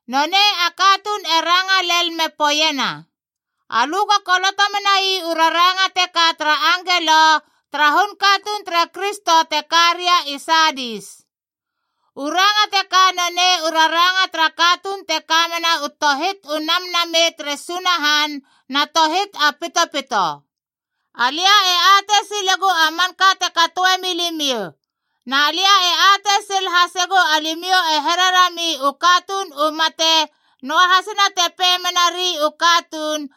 Nonei a katuun e ranga lel me poeiena, “Alö go koloto menai u raranga teka tara angelo tara hun katuun tere Kristo te ka ria i Saadis: “U ranga teka nonei u raranga tara katuun te ka mena u tohit u namnamei tere Sunahan na tohit a pitopito. “Alia e atei silegu a manka te katoe milimiou. Na lia e atei sil hasegu alimiou e hererami u katuun u mate, noahasina te pei menari u katuun,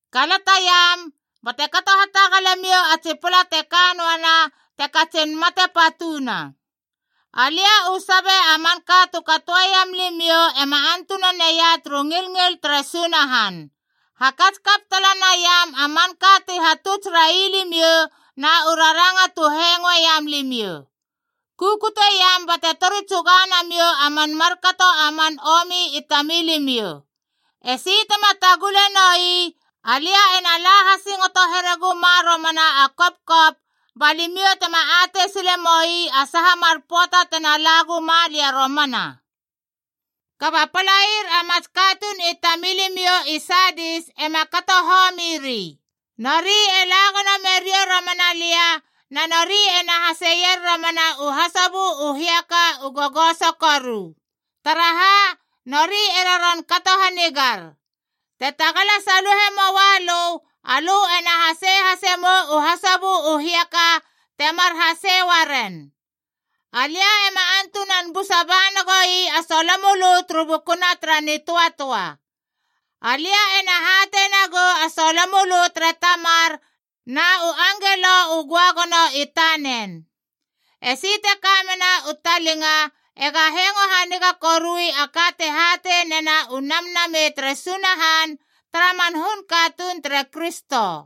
Kalataiam, bate kato hatagale miou a tsi pala te ka noanab te katsin mate patuna. Alia u sabe a manka tu katoeiam limiou ema antuna neia turu ngilngil tere Sunahan. Hakats kap tala naiam a manka ti hatuts rai limiou na u raranga tu hengoe iam limiou. Kukute iam bate tori tsuga namiou a man markato a man omi i tamilimiou. Esi tema tagule nou ii, alia ena la hasingoto here guma romana a kopkop ba limiou tema atei sile moi a saha mar pöata tena la guma lia romana. “Kaba palair a mats katuun i tamilimiou i Saadis ema kato homiri.c Nori e la gono meriou romana lia na nori ena haseier romana u hasobö u hiaka u gogoso koru. Taraha, nori e roron kato hanigar. Te tagala saluhe moalö, alö ena hasei hase mou u hasobö u hiaka temar hasei uaren. Alia ema antunan busa ba nagoi a solomölö turu bukuna tara nitöatöa. Alia ena hatei nagou a solomölö tere Tamar na u angelo u göagono i tanen. “Esi te ka mena u talinga ega hengo haniga korui a ka te hatei nena u Namnamei tere Sunahan tara man hun katuun tere Kristo.”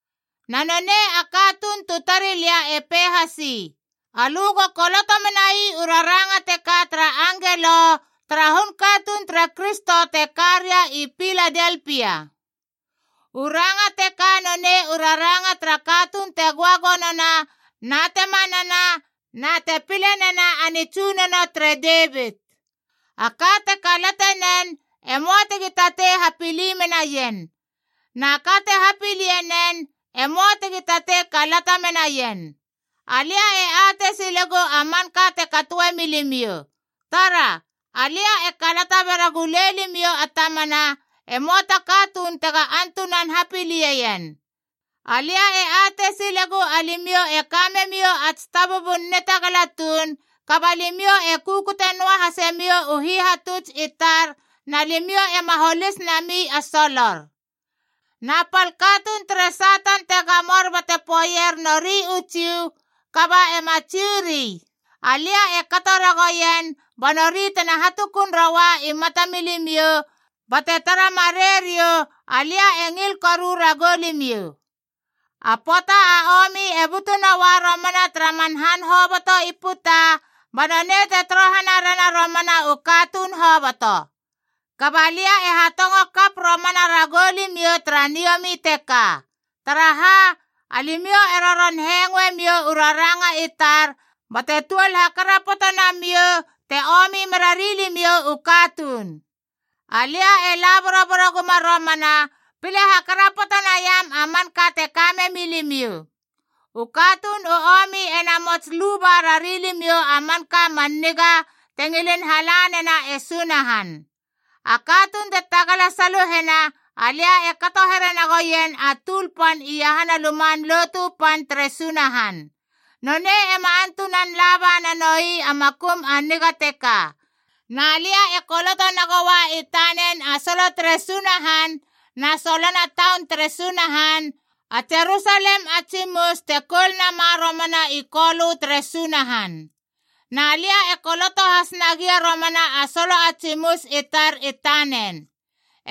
Na nonei a katuun tu tari lia e pei hasi, “Alö go koloto menai u raranga teka tara angelo tara hun katuun tere Kristo te ka ria i Piladelpia: “U ranga teka nonei u raranga tara katuun te göagonona na te manana na te pile nena a nitsunono tere Devit.d A ka te kalate nen, e möa tegi tatei hapili menaien. Na ka te hapilie nen, e möa tegi tatei kalata menaien. “Alia e atei silegu a manka te katoe milimiou. Tara! Alia e kalata be ragulei limiou a tamana, e möa ta katuun tega antunan hapilie ien. Alia e atei silegu alimiou e ka memiou a tsi tabubun nitagala tuun, kaba limiou e kukute noa hase miou u hihatuts i tar na limiou ema holis nami a solor. Na pal katuun tere Satan te gamor bate poeier nori u Jiu kaba ema Jiu ri, alia e kato ragoien, ba nori tena hatukun roua i matamilimiou bate tara marei riou alia e ngil koru ragou limiou. “A pöata a omi e butu noua romana tara man han hoboto i puta, ba nonei te torohana rena romana u katuun hoboto. Kaba lia e hatongo kap romana ragou limiou tara niomi teka. Taraha? Alimiou e roron hengoe miou u raranga i tar bate tuol hakarapoto namiou te omi merari limiou u katuun. Alia e la boroboro guma romana, pile hakarapoto naiam a manka te ka memi limiou. U katuun u omi e namots luba rari limiou a manka a man niga te ngilin hala nena e Sunahan. A katuun te tagala saluhena, alia e kato here nagou ien a tuul pan iahana Luman Lotu Pan tere Sunahan. Nonei ema antunan laba nanou ii a makum a niga teka. Na lia e koloto nagoua i tanen a solo tere Sunahan na solona taun tere Sunahan, a Jerusalem a tsimus te koul nama romana i Kolö tere Sunahan. Na lia e koloto has nagia romana a solo a tsimus i tar i tanen.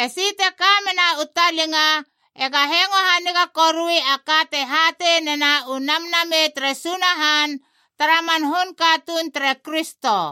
“Esi te ka mena u talinga ega hengo haniga korui a ka te hatei nena u Namnamei tere Sunahan tara man hun katuun tere Kristo.”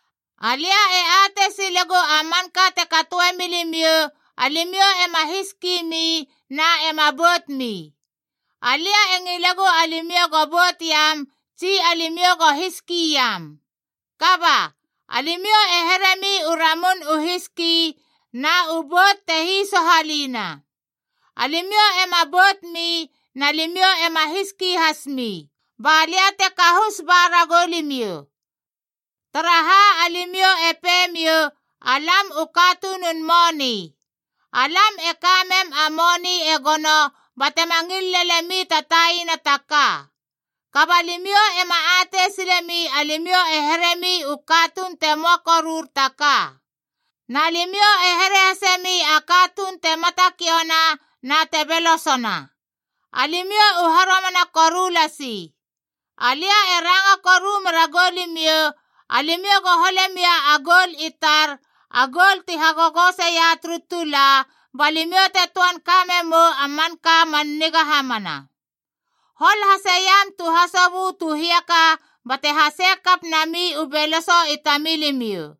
“Alia e atei silegu a manka te katoe milimiou, alimiou ema hiski mi na ema bout mi. Alia e ngilegu alimiou go bout iam tsi alimiou go hiski iam. Kaba, alimiou e heremi u ramun u hiski na u bout te hisohalina. Alimiou ema boutmi na limiou ema hiski hasmi. Ba lia te kahus ba ragou limiou. Taraha, alimiou e pei miou, ‘Alam u katunun moni. Alam e ka mem a moni e gono batema ngil lenemi ta taina ta ka.’ Kaba alimiou ema atei silemi alimiou e heremi u katuun te möa korur ta ka. Na limiou e here hasemi a katuun te matakiouna na te belosona. Alimiou u haromana koru lasi. Alia e ranga koru mera goulimiou, alimiou go hole mia ta goul i tar, a goul ti hagogoseia turu tula, ba limiou te töan ka memou a manka man niga hamana.e Hol hase iam tu hasobö tu hiaka bate hasei kap nami u beloso i tamilimiou.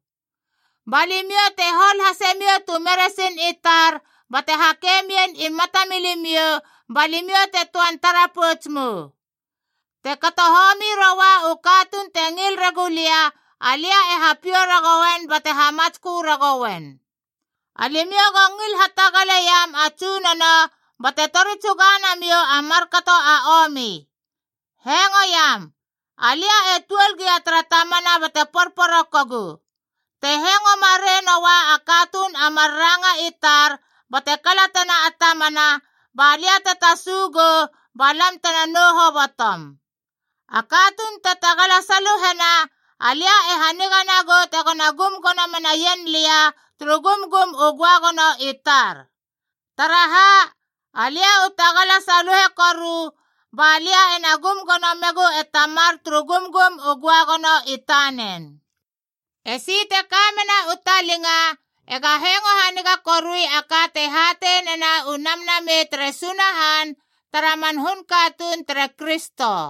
Ba limiou te hol hase miou tu meresin i tar bate hake mien i matamilimiou, ba limiou te töan tara pouts mou. Te kato homi roua u katuun te ngil regu lia, alia e hapiou ragouen bate hamatskö ragouen. Alimiou go ngil hatagale iam a Tsunono bate tori tsuga namiou a markato a omi. “Hengoiam! Alia e tuol gia tara tamana bate porporokogu. Te hengo marei noa a katuun a mar ranga i tar bate kalatena a tamana, ba lia e tasu gou ba lam tena nou hobotom. A katuun te tagala saluhena, alia e haniga nagou tegona gum gono menaien lia turu gumgum u göagono i tar. Taraha, alia u tagala saluhe koru ba lia ena gum gono megu e Tamar turu gumgum u göagono i tanen. “Esi te ka mena u talinga ega hengo haniga korui a ka te hatei nena u Namnamei tere Sunahan tara man hun katuun tere Kristo.”